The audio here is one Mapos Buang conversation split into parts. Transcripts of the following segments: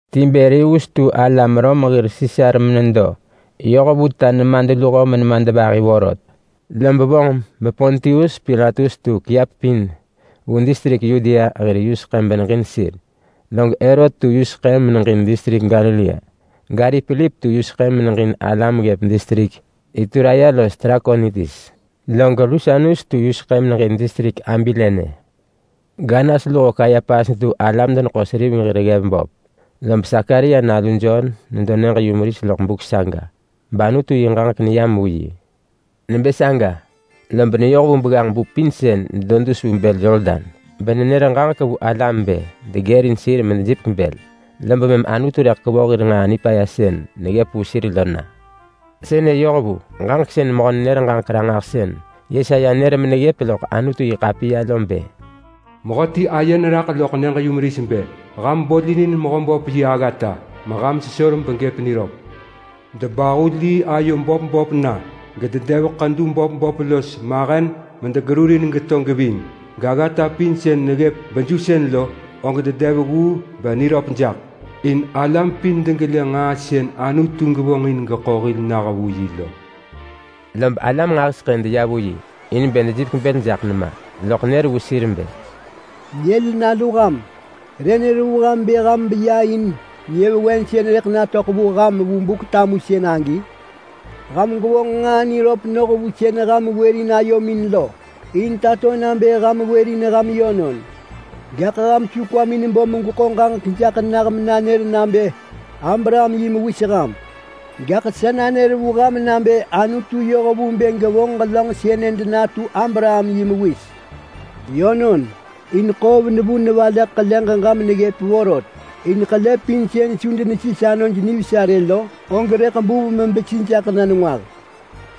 Tiberius tu alam Rom hir Sisar menedo yoh vu ta nemadluho menemadvahi vorot, lob vonġ bePontius Pilatus tu kiap pin vu distrik Yudea hir yuseḳë beneġin sir. Log Herot tu yuseḳë meneġin distrik Galilea, gari Pilip tu yuseḳë meneġin alam ggëp distrik Ituraya los Trakonitis. Log Lusanius tu yuseḳë meneġin distrik Abilene, gAnas luho Kayapas detu alam-deneḳo-seriveng hir ggev böp. Lob Sakaria nalu Jon nedo nyëġ-yumeris loḳ buk saga, bAnutu yi ġaġek neyam vu yi. Nebë saga, lob neyoh vu begganġ-bu pin sën nedo dus vu bël Yordan, benenër ġaġek vu alam bë degërin sir medejipek bël, lob mëm Anutu rëḳ kevoh hir nġaa nipaya sën neggëp vu sir lo na. Sënë yoh vu ġaġek sën mehö-nenër-ġaġek-ranġahsën Yesaya nër meneggëp loḳ Anutu-yi-ḳapiya lo bë: “Mehöti aye neraḳ loḳ nyëġ-yumeris bë: ‘Ham bolinin Mehöböp yi aggata, meham sesor begëp niröp. Debahu lii ayo böp böp na, gededev ḳedu böp böp los mahen medegerurin geto geving. Gaggata pin sën neggëp bejusën lo, og dedev gguu beniveröḳ jaḳ. In alam pin degelë nġaa sën Anutu gevonġ in geḳo hil nah vu yi lo.’” Lob alam nġahiseḳë deya vu yi in bë dejipek bël jaḳ nema, loḳ nër vu sir bë, “Nyël nalu ham! Re nër vu ham bë ham beya in nyëvewen sën rëḳ natöḳ vu ham vu Buk-tamusën agi? Ham gwevonġ nġaa niröp noh vu sën ham wërin ayomin lo, in tato nabë ham wërin ham yönon. Gaḳ ham su kwamin bo megweḳo ġaġek jaḳ nah menanër nabë Abraham yi mewis ham. Gaḳ sa nanër vu ham nabë Anutu yoh vu bë gevonġ ġelönġ sëne denatu Abraham yi mewis. Yönon, in ḳoov nevu nevaleḳ ḳele ġeġa meneggëp vorot. In ḳele pin sën su denesis anoj nivesa rë lo, og rëḳ buv mebesi jaḳ na nengwah.”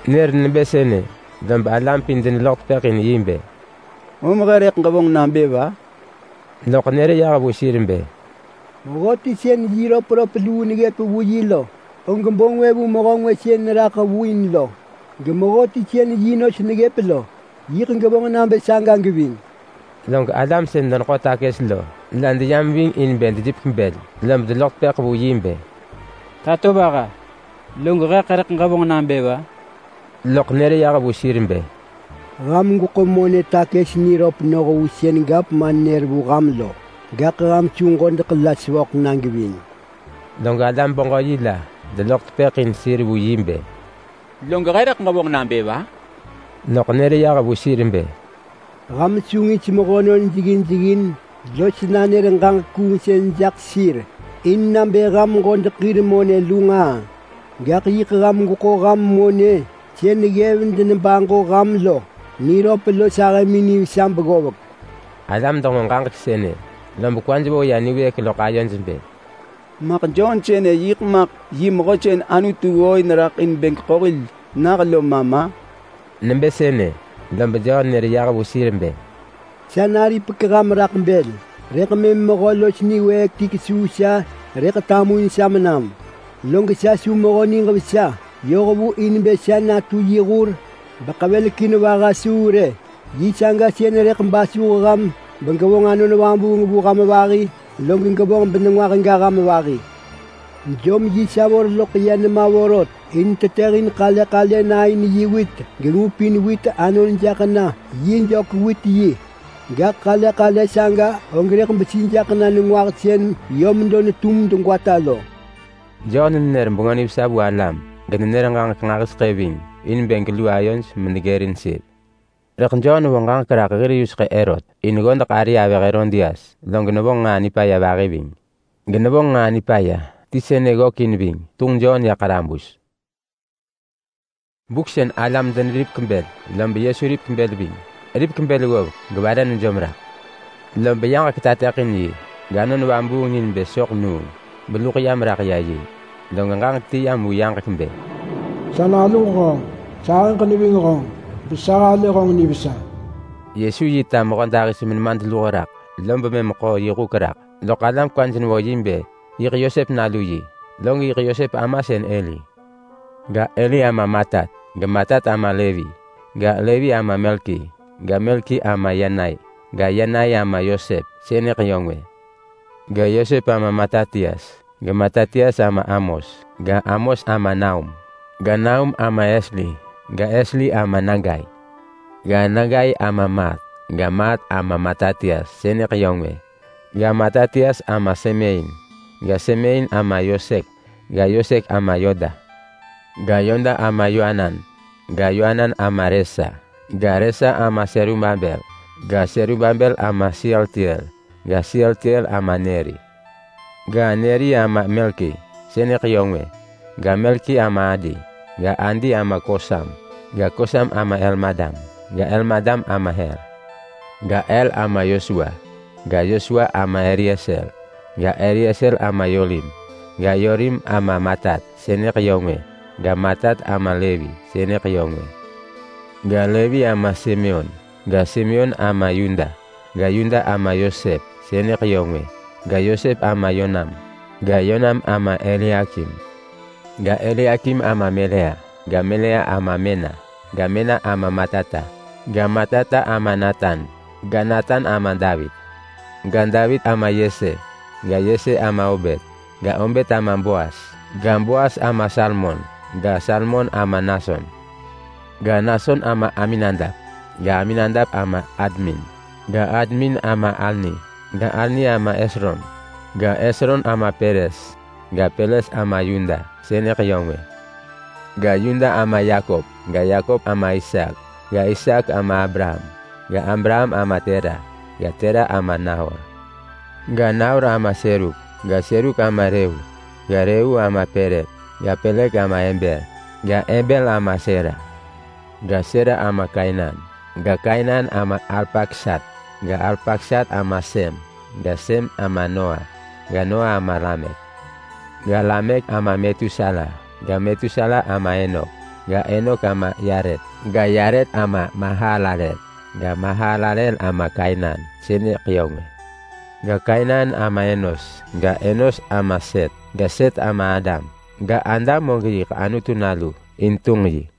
Nër nebë sënë, lob alam pin deneloḳ tepëḳ in yi bë, “Om he rëḳ ġevonġ nabë va?” Loḳ nër yah vu sir bë, “Mehöti sën yi röpröp luu neggëp vu yi lo, og bo ngwë vu mehö ngwë sën neraḳ vu in lo. Gemehöti sën yi nos neggëp lo, yiḳ gevonġ nabë saga geving.” Log alam sën deneḳo takës lo la deyam ving in bë dejipek bël, lob deloḳ tepëḳ vu yi bë, “Tatovaha, log heḳ rëḳ ġevonġ nabë va?” Loḳ nër yah vu sir bë, “Ham gweḳo monë takës niröp noh vu sën gavman nër vu ham lo, gaḳ ham su ġodeḳ la sevöḳ na geving rë.” Log alam-beġö-yi la deloḳ tepëḳ in sir vu yi bë, “Log heḳ rëḳ ġevonġ nabë va?” Loḳ nër yah vu sir bë, “Ham su ngis mehönon jeggin jeggin los nanër ġaġek kuungsën jaḳ sir in nabë ham ġodeḳ hir monë lu nġaa, gaḳ yiḳ ham gweḳo ham monë sën ggev denebaġo ham lo niröp los ahëmin nivesa beggovek.” Alam denġo ġaġek sënë, lob kwaj vo ya niwëëk loḳ ayoj bë, “Maḳ Jon sënë yiḳ maḳ yi Mehö sën Anutu ggooin raḳ in bë geḳo hil nah lo ma ma?” Nebë sënë, lob Jon nër yah vu sir bë, “Sa naripek ham raḳ bël. Rëḳ mëm mehö los niwëëk ti kesuu sa rëḳ tamuin sa menam, log sa su mehö niġ vesa yoh vu in bë sa natu yi hur beḳevelekin vaha suu rë. Yi saga sën rëḳ basuh ham begevonġ Anon Vabuung vu ham vahi begevonġ benengwah ga ham vahi. Jom yi savor loḳ ya nema vorot in tetëhin ḳale ḳale na in yi wit, gengupin wit anon jaḳ na yi jök-wit-yi. Gaḳ ḳale ḳale saga og rëḳ besi jaḳ na nengwah sën yö medo netum degwata lo.” Jon nenër bengö nivesa vu alam genenër ġaġek nġahiseḳë ving in bë gelu ayoj medegërin sir. Rëḳ Jon vo ġaġek raḳ hir yuseḳë Herot, in ggodeḳ ari avëh Herodias log nevonġ nġaa nipaya vahi ving. Genevonġ nġaa nipaya ti sënë ggökin ving: Tunġ Jon ya ḳarabus. Log alam pin deneripek bël, lob Yesu ripek bël ving. Ripek bël ggovek gevare nejom raḳ, lob yaġek tateḳin yi gAnon Vabuung ni nebë soḳ nuung beluḳ yam raḳ ya yi. Log ġaġek ti yam vu yaġek bë, “Sa naluġ honġ. Sahëġ neving honġ besa halë honġ nivesa.” Yesu yi ta mehödahis-menemadluho raḳ, lob mëm ḳo yi huk raḳ. Loḳ alam kwaj nevo yi bë yiḳ Yosep nalu yi. Log yiḳ Yosep ama Heli. Ga, Heli ama Matat, geMatat ama Levi ga, Levi ama Melki. Ga, Melki ama Yanai ga, Yanai ama Yosep (sënëḳ yö ngwë). Ga, Yosep ama Matatias ga, Matatias ama Amos. Ga, Amos ama Naum ga, Naum ama Esli. Ga, Esli ama Nagai. Ga, Nagai ama Maat. Ga, Maat ama Matatias (sënëḳ yö ngwë), ga, Matatias ama Semein. Ga, Semein ama Yosek ga, Yosek ama Yoda. Ga, Yoda ama Yoanan ga, Yoanan ama Resa. Ga, Resa ama Serubabel ga, Serubabel ama Sealtiel. Ga, Sealtiel ama Neri. Ga, Neri ama Melki, (sënëḳ yö ngwë). Ga, Melki ama Adi ga, Adi ama Kosam. Ga, Kosam ama Elmadam ga, Elmadam ama Er. Ga, Er ama Yosua ga, Yosua ama Elieser. Ga, Elieser ama Yorim ga, Yorim ama Matat (sënëḳ yö ngwë). Ga, Matat ama Levi (sënëḳ yö ngwë). Ga, Levi ama Simeon. Ga, Simeon ama Yuda ga, Yuda ama Yosep (sënëḳ yö ngwë). Ga, Yosep ama Yonam ga, Yonam ama Eliakim. Ga, Eliakim ama Melea ga, Melea ama Mena. Ga, Mena ama Matata ga, Matata ama Natan. Ga, Natan ama Davit. Ga, Davit ama Yese. Ga, Yese ama Obet ga, Obet ama Boas. Ga, Boas ama Salmon ga, Salmon ama Nason. Ga, Nason ama Aminadap ga, Aminadap ama Admin ga, Admin ama Arni. Ga, Arni ama Hesron ga, Hesron ama Peres. Ga, Peres ama Yuda (sënëḳ yö ngwë). Ga, Yuda ama Yakop. Ga, Yakop ama Isaak ga, Isaak ama Abraham. Ga, Abraham ama Tera ga, Tera ama Nahor. Ga, Nahor ama Seruk ga, Seruk ama Reyu. Ga, Reyu ama Pelek ga, Pelek ama Eber. Ga, Eber ama Sela. Ga, Sela ama Kainan. Ga, Kainan ama Arpaksat ga, Arpaksat ama Sem. Ga, Sem ama Noa ga, Noa ama Lamek. Ga, Lamek ama Metusala ga, Metusala ama Enok. Ga, Enok ama Yaret ga, Yaret ama Mahalalel. Ga, Mahalalel ama Kainan (sënëḳ yö ngwë). Ga, Kainan ama Enos. Ga, Enos ama Set ga, Set ama Adam. Ga, Adam og yiḳ Anutu nalu in tunġ yi.